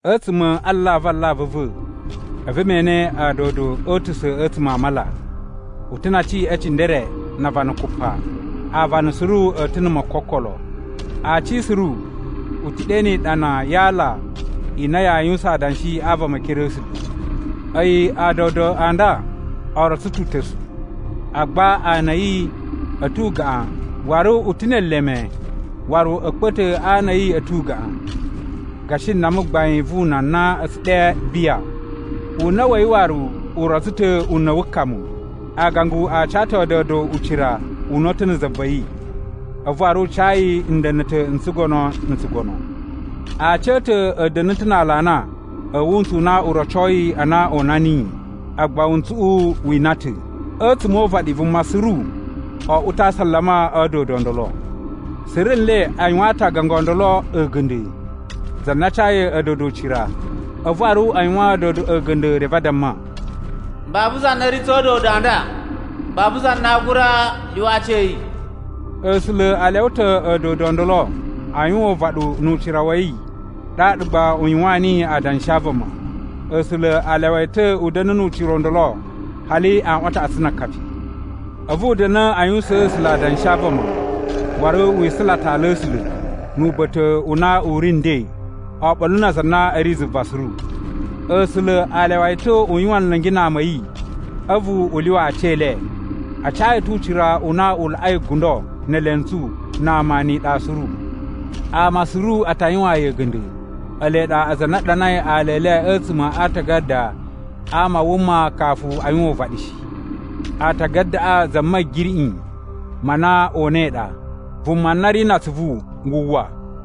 A̱tsuma̱ a alavu alavu a̱ va̱ a̱vu me ene a̱a̱dodo o utusa̱ a̱tsuma̱ a mala. U ta̱ na aci e cindere na avana kupa. Aavana suru a̱ ta̱ na̱ mokokolo. Aaci suru u ta̱ ɗe ni iɗana ya aala i na yaa yuwusan adanshi a vama e ekere a̱ A̱sula̱. A̱yi a̱a̱dodo a nda o rotso ta̱ uta̱su, agba ana a̱ yi a̱ ta̱ ugaꞌan waru u ta̱ ne eleme waru a̱kpa̱ta̱ a ana a̱ yi a̱ ta̱ ugaꞌan, gashi nama gbain vu una na a̱ tsu ɗe biya. Una̱ wa̱ yi waru u rotso ta̱ una̱ wu kamu. Aagangu a ca ta̱ a̱a̱dodo ucira una̱ta̱ na̱ za va̱ yi, a̱vu waru u ca yi nda̱na̱ta̱ n tsugono na̱ tsugono. Aaci a̱ ta̱ a̱ da̱na̱ ta̱ na aalana a̱ wuntsu u na u rocoi a na o una niyi, agba wuntsuꞌu wi ina ta̱. A̱tsuma̱ o uvaɗi vuma suru oꞌwo ta̱ a asalama a̱ a̱a̱dodo o ndolo. Suru nle a yuwaan ta̱ aagangu o ndolo a̱ga̱nda̱, za na cayi a̱a̱dodo ucira. A̱vu waru a yuwaan a̱a̱dodoꞌo a̱ga̱nda̱ reve a damma, “Babu za na ri tsa̱ a̱a̱dodo a nda! Babu za na aa gura lyuwa aci a̱ yi.” A̱sula̱ a lyawa ta̱ a̱a̱dodo o ndolo a yuwan uvaɗu nu ucira wa̱ yi ɗaɗa gba u yuwaan niyi adanshi a vama. A̱sula̱ a lyawa yi ta̱ u da̱na̱ nu ucira u ndolo hali aꞌwan a taꞌatsu na akapi. A̱vu u da̱na̱ a yuwusaan A̱sula̱ adanshi a vama. Waru wi isula ta̱ ala a̱ A̱sula̱, nu uba̱ta̱ u na u ri nden, oɓolo na aza a na a̱ ri zuva suru. A̱sula̱ a lyawa yi ta̱ u yuwan nla̱ngi na ama a̱ yi a̱vu u lyuwa aci e le. A ca yi ta̱ ucira u na u laꞌai gundo, ne elentsu, na ama, ni iɗa suru. Ama suru a ta yuwaan yi a̱ga̱nda̱, ele ɗa aza a na a ɗanai ala e le a̱tsuma̱ a aatagada a ama a wuma kafu a yuwan uvaɗi shi. Aatagadaꞌa za Ma̱giriꞌi ma na o unai ɗa. Vuma na ri na atsuvu, wu uwwa.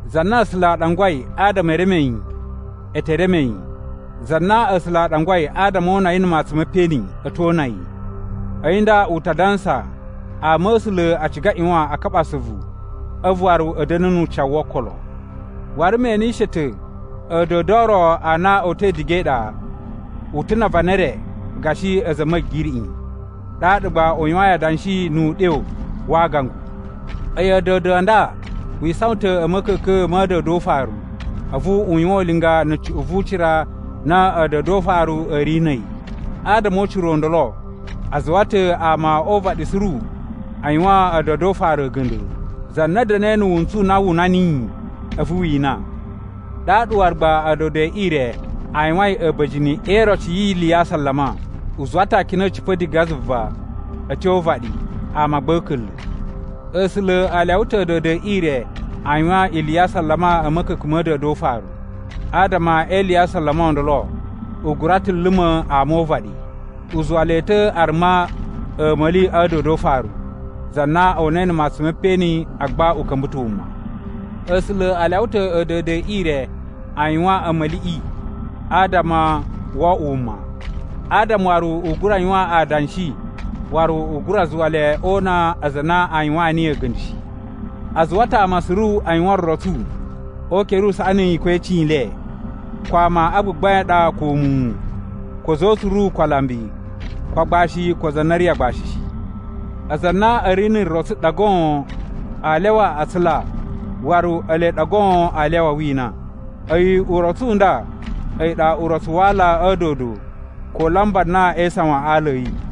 Za na A̱sula̱ a ɗangwai adama e reme yi, e te reme yi. Za na A̱sula̱ a ɗangwai adama o una yi na̱ matsun me peꞌeni, a̱ to una yi. A̱yi nda u ta dansa ama a̱ A̱sula̱ a ciga a ꞌyuwan a kaɓa asuvu a̱vu waru a̱ da̱na̱ nu ucawu wo okolo. Waru me enishe ta̱ a̱a̱dodo o ro a na o uta̱i diga e iɗa. U ta̱ na avana e re gashi a̱za̱ a̱ ma̱giriꞌi, ɗaɗa gba u yuwain adanshi nu uɗyo wa aagangu. A̱yi a̱a̱dodo a nda wi isawan ta̱ a̱ ma̱ka̱ka̱n ma̱ a̱a̱dodo o ufaru, a̱vu u yuwan ulinga na̱ cuꞌun vu ucira na a̱a̱dodo o ufaru a̱ ri na̱ a̱yi. Adama o ucira o ndolo a zuwa ta̱ ama o uvaɗi suru a yuwaan a̱a̱dodo o ufaru a̱ga̱nda̱, za na da̱na̱i na̱ wuntsu u na wu una niyi a̱vu wi ina yi. Ɗaɗa waru gba a̱a̱dodo e ire a yuwain a̱ba̱jini e iroci yi ili ya asalama. U zuwa ta̱ akina a̱ cipa̱ diga zuva a̱ tyo o uvaɗi, ama gba a̱ a̱ka̱nla̱. A̱sula̱ a lyawa ta̱ a̱a̱dodo e ire a yuwan ili ya asalama a̱ ma̱ka̱ka̱n ma̱ a̱a̱dodo o ufaru. Adama e ili ya asalama o ndolo, u gura ta̱ luma̱ ama o uvaɗi. U zuwa le ta̱ a ruma a̱a̱ma̱li a̱ a̱a̱dodo o ufaru, za na o unai na̱ matsun me peꞌeni agba u ka̱mba̱ ta̱ wuma. A̱sula̱ a lyawa ta̱ a̱a̱dodo e ire a yuwan a̱a̱ma̱liꞌi adama wo oꞌwo wuma, adama waru u gura yuwan adanshi waru u gura zuwa le o una aza a na a yuwaan niyi a̱ga̱nda̱ shi. A zuwa ta̱ ama suru a yuwan rotsu o ukere usaꞌani ko e icin i le, ko ama a gbagbain a ɗa ko muwun, ko a̱za̱ o utsuru ko alambi, ko agbashi ko aza a na a̱ ri agbashi shi. Aza a na a̱ ri na̱ rotsu ɗa goon aa lyawa a tsula waru ele ɗa goon aa lyawa a wina. A̱yi urotsu u nda a̱yi ɗa urotsu wa aala a̱ a̱a̱dodo ko laamba na ee isawan a aala a̱ yi.